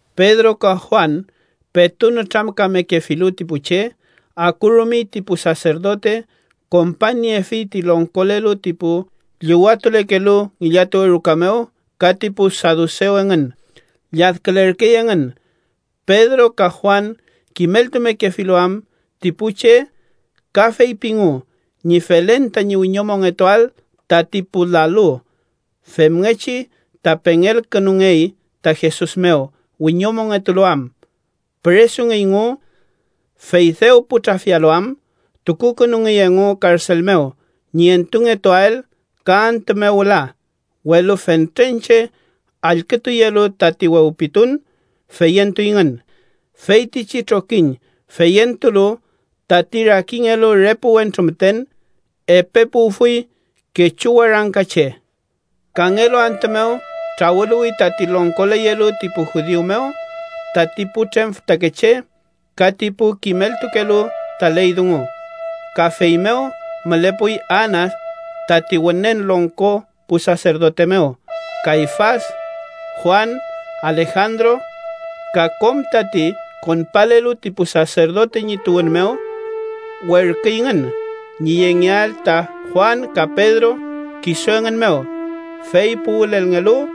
Pedro ka Juan petu nütramkamekefilu ti pu che, akurumey ti pu saserdote kompañniefi ti longkolelu ti pu llüwatulekelu ngillatuwe ruka mew ka ti pu sadusew engün. Lladkülerkey engün, Pedro ka Juan kimeltumekefilu am ti pu che ka feypingu ñi felen tañi wiñomongetuael tati pu lalu femngechi ta pengelkünungey ta Jesus mew wiñomongetulu am. Püresungeyngu, fey dew pu trafialu am, tukukünungey engu karsel mew ñi entungetuael ka antü mew wüla. Welu fentren che allkütuyelu tati wewpitun, feyentuyngün. Feytichi trokiñ feyentulu tati rakingelu re pu wentru müten, epe puwfuy kechu warangka che. Kangelu antü mew trawüluwi tati longkoleyelu ti pu judiu mew, tati putrem fütakeche ka tati pu kimeltukelu ta ley dungu. Ka fey mew mülepuy Anas tati Wünen Longko pu saserdote mew, Kayfas, Juan, Alejandro, ka kom tati konpalelu ti pu saserdote ñi tuwün mew. Werküyngün ñi yengeael ta Juan ka Pedro kisu engün mew, fey puwülelngelu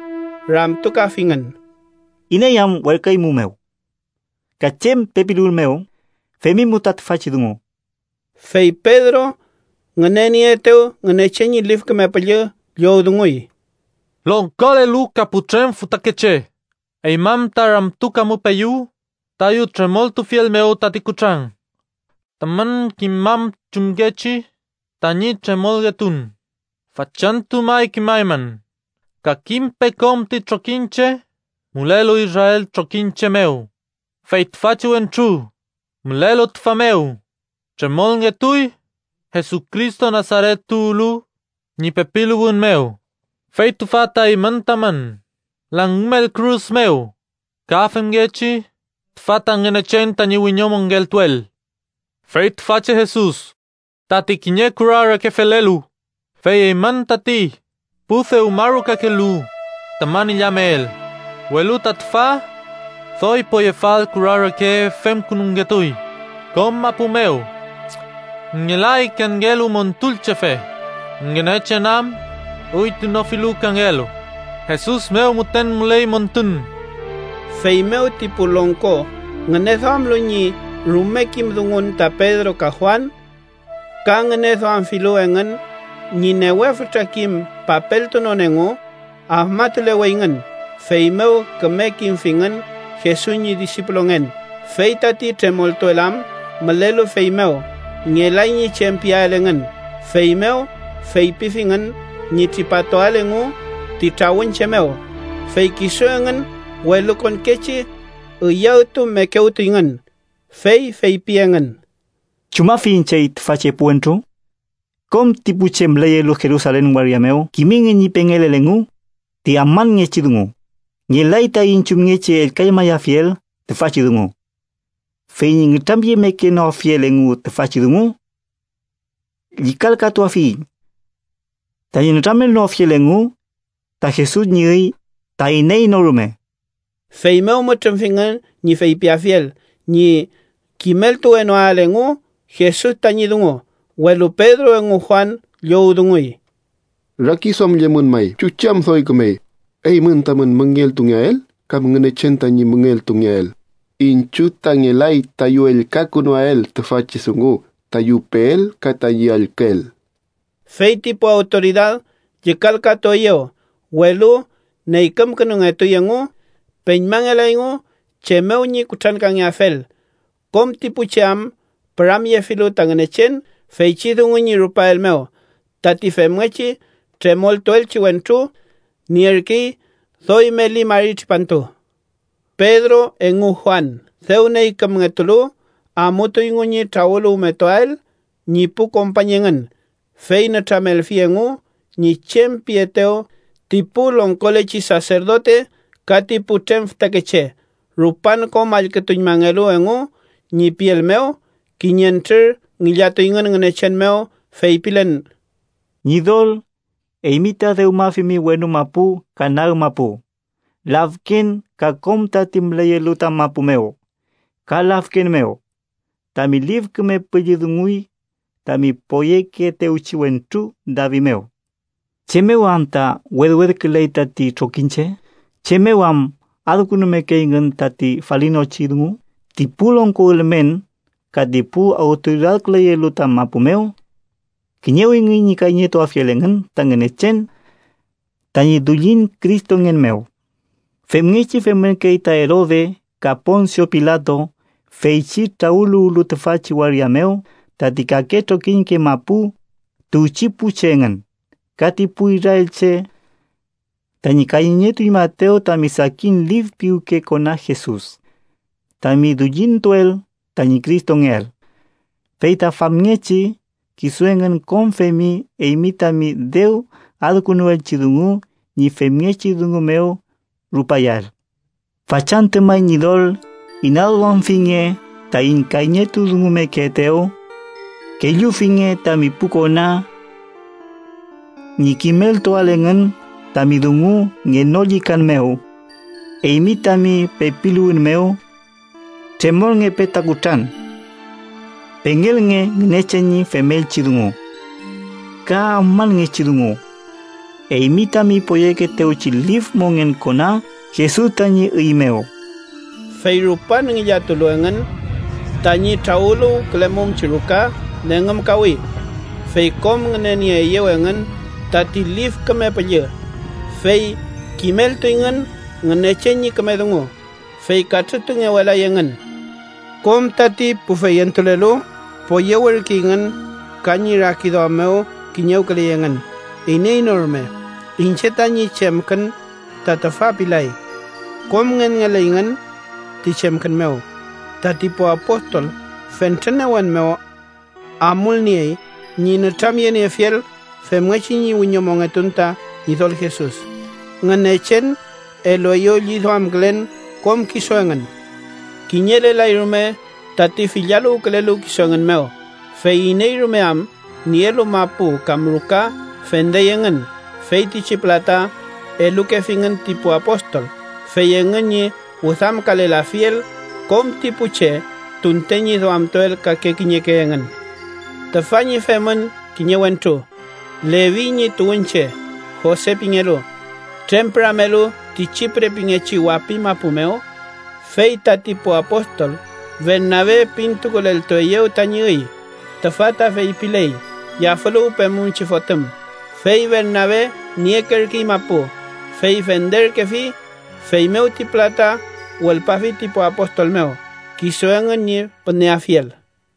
ramtukafingün: —¿Iney am werküeymumew? ¿Ka chem pepiluwün mew femimu ta tüfachi dungu? Fey Pedro ngünenieetew Ngünechen ñi Lif Küme Püllü llowdunguy: —¡Longkolelu ka putrem fütakeche! Eymün ta ramtukamupeyu tayu tremoltufiel mew tati kutran, tamün kimam chumngechi tañi tremolngetun. Fachantü may kimaymün, ka kimpe kom ti trokiñche mülelu Israel trokiñche mew. Fey tüfachi wentru, mülelu tüfa mew, tremolngetuy Jesucristo Nasaret tuwlu ñi pepiluwün mew, fey tüfa ta eymün tamün langümel kürus mew ka femngechi tüfa ta Ngünechen tañi wiñomongeltuel. Fey tüfachi Jesus ‘tati kiñe kura reke felelu, fey eymün tati pu dewmarukakelu tamün illamel, welu ta tüfa doy poyefal kura reke femkünungetuy.’ “Kom mapu mew ngelay kangelu Montulchefe, Ngünechen am üytunofilu kangelu. Jesus mew müten müley montun.” Feymew ti pu longko ngüneduamlu ñi rume kim dungun ta Pedro ka Juan, ka ngüneduamfilu engün ñi newe fütra kim papeltunon engu, afmatuleweyngün. Feymew küme kimfingün Jesus ñi disipulungen. Fey tati tremoltuel am mülelu fey mew, ngelay ñi chem piael engün. Feymew feypifingün ñi tripatuael engu ti trawün che mew, fey kisu engün welukonkechi üyawtumekewtuyngün. Fey feypi engün: “¿Chumafiyiñ chey tüfachi epu wentru? Kom ti pu che müleyelu Jerusalen waria mew kimingün ñi pengelel engu ti afmanngechi dungu. Ngelay taiñ chumngechi ellkañmayafiel tüfachi dungu. Fey ñi nütramyemekewenoafiel engu tüfachi dungu, llükalkatuafiyiñ tañi nütramelnoafiel fey engu ta Jesus ñi üy ta iney no rume.” Feymew mütrümfingün ñi feypiafiel ñi kimeltuwenoael engu Jesus tañi dungu. Welu Pedro engu Juan llowdunguy: —Rakiduamllemün may chuchi am doy kümey: eymün tamün müngeltungeael kam Ngünechen tañi müngeltungeael. Iñchiw ta ngelay tayu ellkakünuael tüfachi dungu tayu peel ka tayu allküel. Fey ti pu awtoridad llükalkatueyew, welu neykümkünungetuy engu. Peñmangelayngu chem mew ñi kutrankangeafel, kom ti pu che am püramyefilu ta Ngünechen feychi dungu ñi rupael mew. Tati femngechi tremoltuelchi wentru, nierkey doy meli mari tripantu. Pedro engu Juan, dew neykümngetulu, amutuyngu ñi trawüluwmetuael ñi pu kompañ engün, fey nütramelfi engu ñi chem pietew ti pu longkolechi saserdote ka ti putrem fütakeche. Rupan kom allkütuñmangelu engu ñi piel mew, kiñentrür ngillatuyngün Ngünechen mew feypilen: “Ñidol, eymi ta dewmafimi wenu mapu, ka nag mapu, lafken ka kom tati müleyelu ta mapu mew ka lafken mew. Tami Lif Küme Püllü dunguy tami poyekeetewchi wentru David mew: ‘¿Chem mew anta wedwedküley tati trokiñche? ¿Chem mew am adkünumekeyngün tati falinochi dungu? Ti pu longko ülmen ka ti pu awtoridadküleyelu ta mapu mew kiñewingün ñi kayñeltuafiel engün ta Ngünechen tañi dullin Cristongen mew.’ Femngechi femürkey ta Erode ka Ponsio Pilato, feychi trawüluwlu tüfachi waria mew tati kake trokiñke mapu tuwchi pu che engün ka ti pu israelche tañi kayñetuñmaetew tami sakin lif piwke kona Jesus, tami dullintuel tañi Cristongeael. Fey ta famngechi kisu engün kom femi eymi tami dew adkünuelchi dungu ñi femngechi dungu mew rupayael. Fachantü may Ñidol inaduamfinge taiñ kayñetudungumekeetew, kellufinge tami pu kona ñi kimeltuael engün tami dungu ngenollükan mew. Eymi tami pepiluwün mew tremolngepe ta kutran, pengelnge Ngünechen ñi femelchi dungu ka afmanngechi dungu eymi tami poyekeetewchi lif mongen kona Jesus tañi üy mew.” Fey rupan ngillatulu engün, tañi trawüluwkülemumchi ruka nengümkawi. Fey kom ngünenieeyew engün tati Lif Küme Püllü, fey kimeltuyngün Ngünechen ñi küme dungu. Fey katrütungewelay engün. Kom tati pu feyentulelu poyewürkeyngün ka ñi rakiduam mew kiñewküley engün. Iney no rume “iñche tañi chemkün ta tüfa” pilay. Kom ngenngelerkeyngün ti chemkün mew. Tati pu apostol fentren newen mew amulniey ñi nütramyeniefiel femngechi ñi wiñomongetun ta Ñidol Jesus. Ngünechen elueyew lliduamkülen kom kisu engün. Kiñelelay rume tati fillaluwkülelu kisu engün mew, fey iney rume am nielu mapu kam ruka, fendey engün. Feytichi pülata elukefingün ti pu apostol, fey engün ñi wüdamkalelafiel kom ti pu che tunten ñi duamtuel kake kiñeke engün. Tüfa ñi femün kiñe wentru, Levi ñi tuwünche, Jose pingelu, trempüramelu ti Chipre pingechi wapi mapu mew. Fey tati pu apostol Bernabe pintukuleltueyew tañi üy (tüfa ta feypiley: yafüluwpemumchi fotüm). Fey Bernabe niekerkey mapu, fey fenderkefi, feymew ti pülata wülpafi ti pu apostol mew, kisu engün ñi püneafiel.